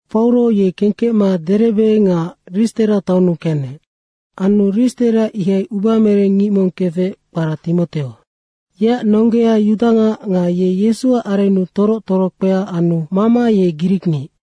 Pauro ye kengkecma Derebe nga Ristera taonnu kenec. Anu Ristera ihai ubamereng ngic mong kefec, kpara Timoteo. Yeac nonggea yudangac nga ye Yesuac arennu toroc torokpea anu mama ye grikngic.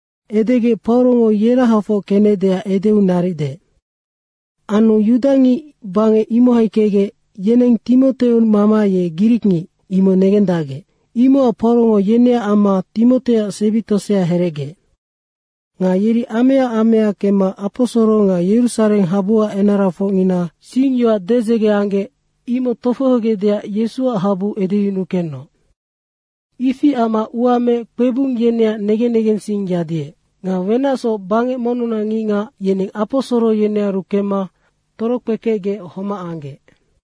Edegec Paurongo yerahafoc kenecdeac edeu naric deec. Anu yudangic bangec imohai kecgec, yeneng Timoteo mama ye grikngic, imoc negendacgec. Imocac Paurongo yeneac amma Timoteoac sebi tosea herecgeec. Nga yeri amaea amaea kemma aposoro nga Yerusareng habuac enarafocngina singyoac dedzege anggec, imoc tofohogecdeac Yesuac habu edeyunukenoc. Ifi amma ua meec kpebung yeneac negen negensing yadiec. Nga wenacsoc bangec monnunac ngicngac, yeneng aposoro yenearu kemma torokpekecgec homac anggec.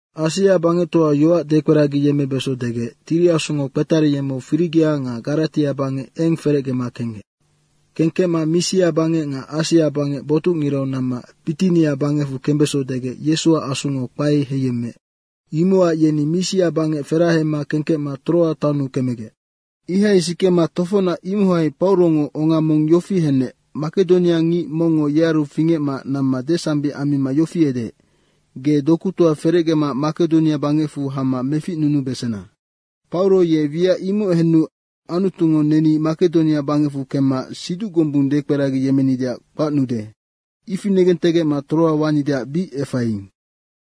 Asia bangectoau yoac dekperagiyemmebeso degec Tiri Asungo kpetariyemmeu Firigia nga Garatia bangec eng ferecgema kenggec. Kengkecma Misia bangec nga Asia bangec botucngirau namma Bitinia bangecfu kembeso degec Yesuac Asungo kpae heiyemmeec. Imocac yeni Misia bangec ferahema kengkecma Troa taonnu kemegec. Ihai sikema tofocnac imohai Paurongo onga mong yofi henec, Makedoniangic mongngo yearu fingecma namma desambic ammima yofi edeec, “Ge dokutoa ferecgema Makedonia bangecfu hama meficnunubesena.” Pauro ye wiac imoc henu Anutungo neni Makedonia bangecfu kemma siduc gombung dekperagiyemmenideac kpacnude, ifi negentegecma Troa wanideac bic efaiing.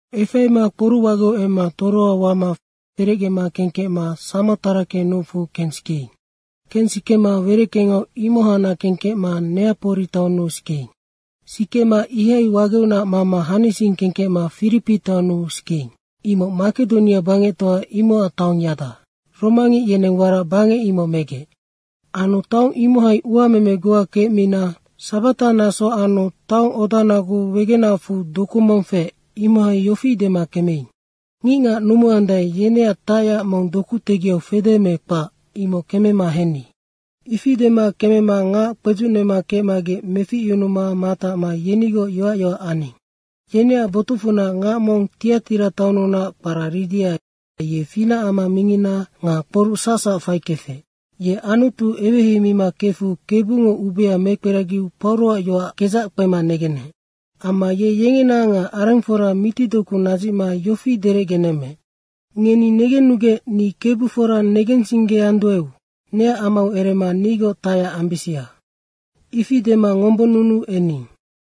Efaima kporucwageu emma Troa wama ferecgema kengkecma Samotrake nucfu kensikeing. Kensikema wereckengau imohacnac kengkecma Neapori taonnu sikeing. Sikema ihai wageunac mama hanising kengkecma Firipi taonnu sikeing. Imoc Makedonia bangectoa imocac taongyada. Romangic yeneng warac bangec imoc megec. Anu taong imohai uameme goa kecmina sabata naso anu taong odanagu wegenacfu doku mong feec, imohai yofi dema kemeing, “Ngicngac numuandae, yeneac tacyac mong doku tegiau fede me kpac, imoc kemema henni.” Ifi dema kemema ngac kpedzucnema kecmagec meficyunuma matacma yenigoc yoac yoac aning. Yeneac botucfunac ngac mong Tiatira taonnunac kpara Ridia, ye finacama mingina nga kporuc sacsac faikefec. Ye Anutu eweheimima kefu Kebungo ubea mekperagiu Pauroac yoac kedzac kpema negenec. Amma ye yengena nga arengfora mitidoku nadzicma yofi derecgenemmeec, “Ngeni negennugec ni Kebu fora negensinggeanduaeu neac amau erema nigoc tacyac ambisia.” Ifi dema ngombonnunuu ening.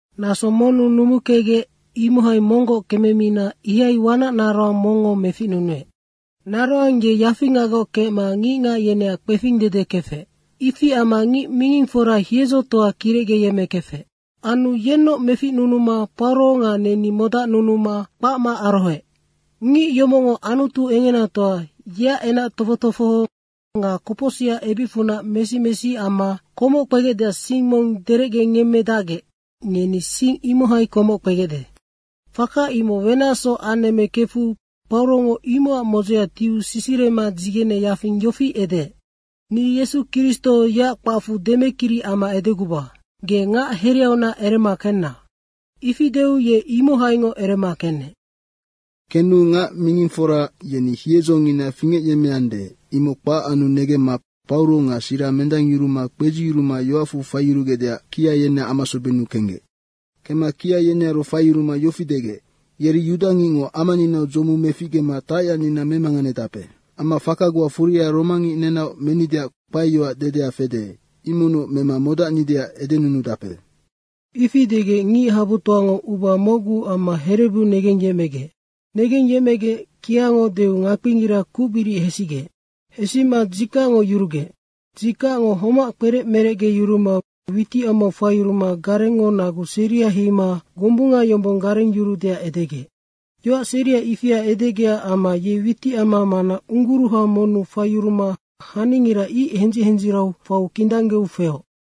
Naso monnu numukecgec, imohai monggoc kememina ihai wanac naroang mongngo meficnunuec. Naroang ye yafingagoc kecma ngicngac yeneac kpefingdede kefec. Ifi amma ngic mingingfora hiedzotoa kirecgeyemmekefec. Anu yennoc meficnunuma Pauro nga neni modacnunuma kpacma arohoec, “Ngic yomocngo Anutu Engenatoa, yeac enac tofoc tofoho nga kopocsicac ebicfunac mesi mesi amma komoc kpegecdeac sing mong derecgenemmedacgec ngeni sing imohai komoc kpegecde.” Faka imoc wenacsoc anemmekefu Paurongo imocac modzea tiu sisirema dzigene yafing yofi edeec, “Ni Yesu Kristo yeac kpacfu demekiri amma edeguba, ge ngac hereunac erema kenna.” Ifi deu ye imohaingoc erema kenec. Kenu ngac mingingfora yeni hiedzongina fingecyemmeande, imoc kpac anu negemma Pauro nga Sira mendangyuruma kpedziyuruma yoacfu faiyurugecdeac kia yeneac amasobennu kenggec. Kemma kia yenearu faiyuruma yofi degec, “Yeri yudangicngo amaninau dzomu meficgema tacyacnina memanganedape. Amma faka goa furia romangic nenaoc menideac kpaeyoac dedea fede, imocnoc mema modacdacnideac edenunudape.” Ifi degec ngichabutoango uba mocgu amma herebu negengyecmegec. Negengyecmegec kiango deu ngakpingira kucbiric hesigec. Hesima dzikacngo yurugec. Dzikacngo homac kperec merecgeyuruma witicamau faiyuruma garengngo nagu seria heima gombunga yombong garengyuruudeac edegec. Yoac seria ifia edegecac amma ye witicama mana ungguruha monnu faiyuruma haningira ic hendzic hendzirau faiu kindanggeu feoc.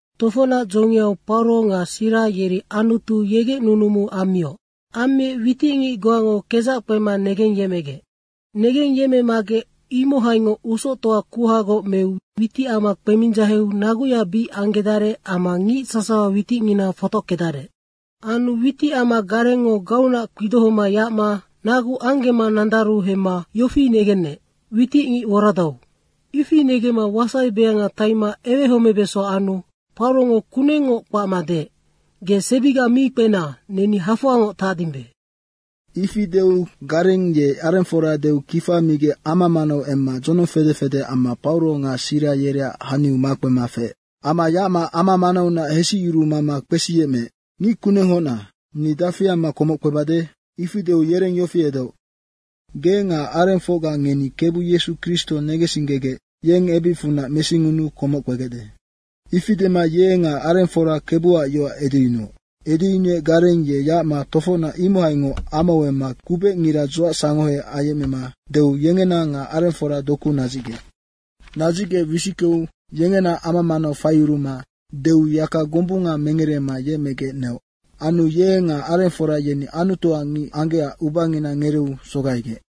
Tofocnac dzongiau Pauro nga Sira yeri Anutu yegec nunumu ammioc. Ammiec witicngic goango kedzac kpema negengyecmegec. Negengyecmemagec, imohaingoc usoctoa kuhagoc meu witicama kpemindzaheu naguya bic anggedarec amma ngic sasawa witicngina fotockedarec. Anu witicama garengngo gauunac kpidohoma yacma nagu anggema nandaru hemma, yofi negenec, “Witicngic woradau.” ifi negemma wasaibeanga taima ewehomebeso anu Paurongo kungengngoc kpacma deec, “Ge sebiga mi kpena, neni hafoangoc tacdimbe.” Ifi deu gareng ye arengfora deu kifa migec ama manau emma dzonong fede fede amma Pauro nga Sira yereac haniu makpema feec. Amma yacma ama manaunac hesicyuru mama kpesiyecmeec, “Ngickunenghocna, ni dafi amma komoc kpebade?” Ifi deu yereng yofi edeoc, “Ge nga arengfocga ngeni Kebu Yesu Kristo negensinggegec yeng ebicfunac mesingunuu komoc kpegecde.” Ifi dema ye nga arengfora Kebuac yoac edeyunuoc. Edeyunuec gareng ye yacma tofocnac imohaingoc amau emma kubecngira dzuacsangohe ayecmema deu yengena nga arengfora doku nadzicgec. Nadzicgec wisickeu yengena ama manau faiyuruma deu yaka gombunga mengerema yemecgec neoc. Anu ye nga arengfora yeni Anutuac ngic anggecac ubangina ngereeu sogaigec.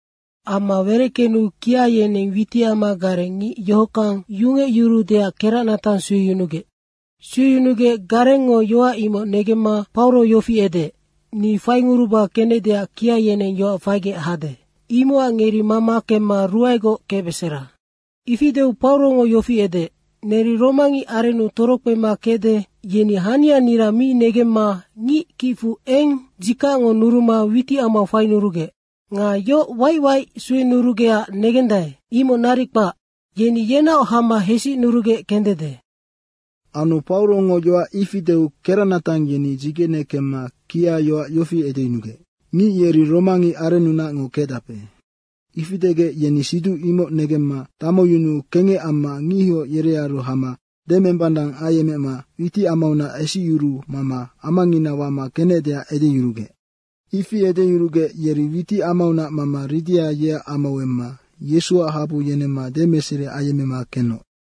Ama wereckenu kia yeneng witicama gareng ngic yohockang yungecyuruudeac keracnatang sueyunugec. Sueyunugec garengngo yoac imoc negemma Pauro yofi edeec, “Ni fainguruba kenecdeac kia yeneng yoac faigec hade. Imocac ngeri mama kemma ruaegoc kecbesera.” Ifi deu Paurongo yofi edeec, “Neri romangic arennu torokpema kecde, yeni hanianira mi negendacma ngic kicfu eng dzikacngo nuruma witicamau fainurugec. Nga yoc waic waic suenurugecac negendae, imoc naric kpac. Yeni yenaoc hama hesicnurugec kendede.” Anu Paurongo yoac ifi deu keracnatang yeni dzigene kemma kia yoac yofi edeyunugec, “Ngic yeri romangic arennunacngo kecdape.” Ifi degec yeni siduc imoc negemma damuyunuu kengec amma ngihoc yerearu hama demembanang ayecmema witicamaunac hesicyuru mama amangina wama kenecdeac edeyurugec. Ifi edeyurugec yeri witicamaunac mama Ridia yeac amau emma Yesuac habu yenemma demeseri ayemmema kenoc.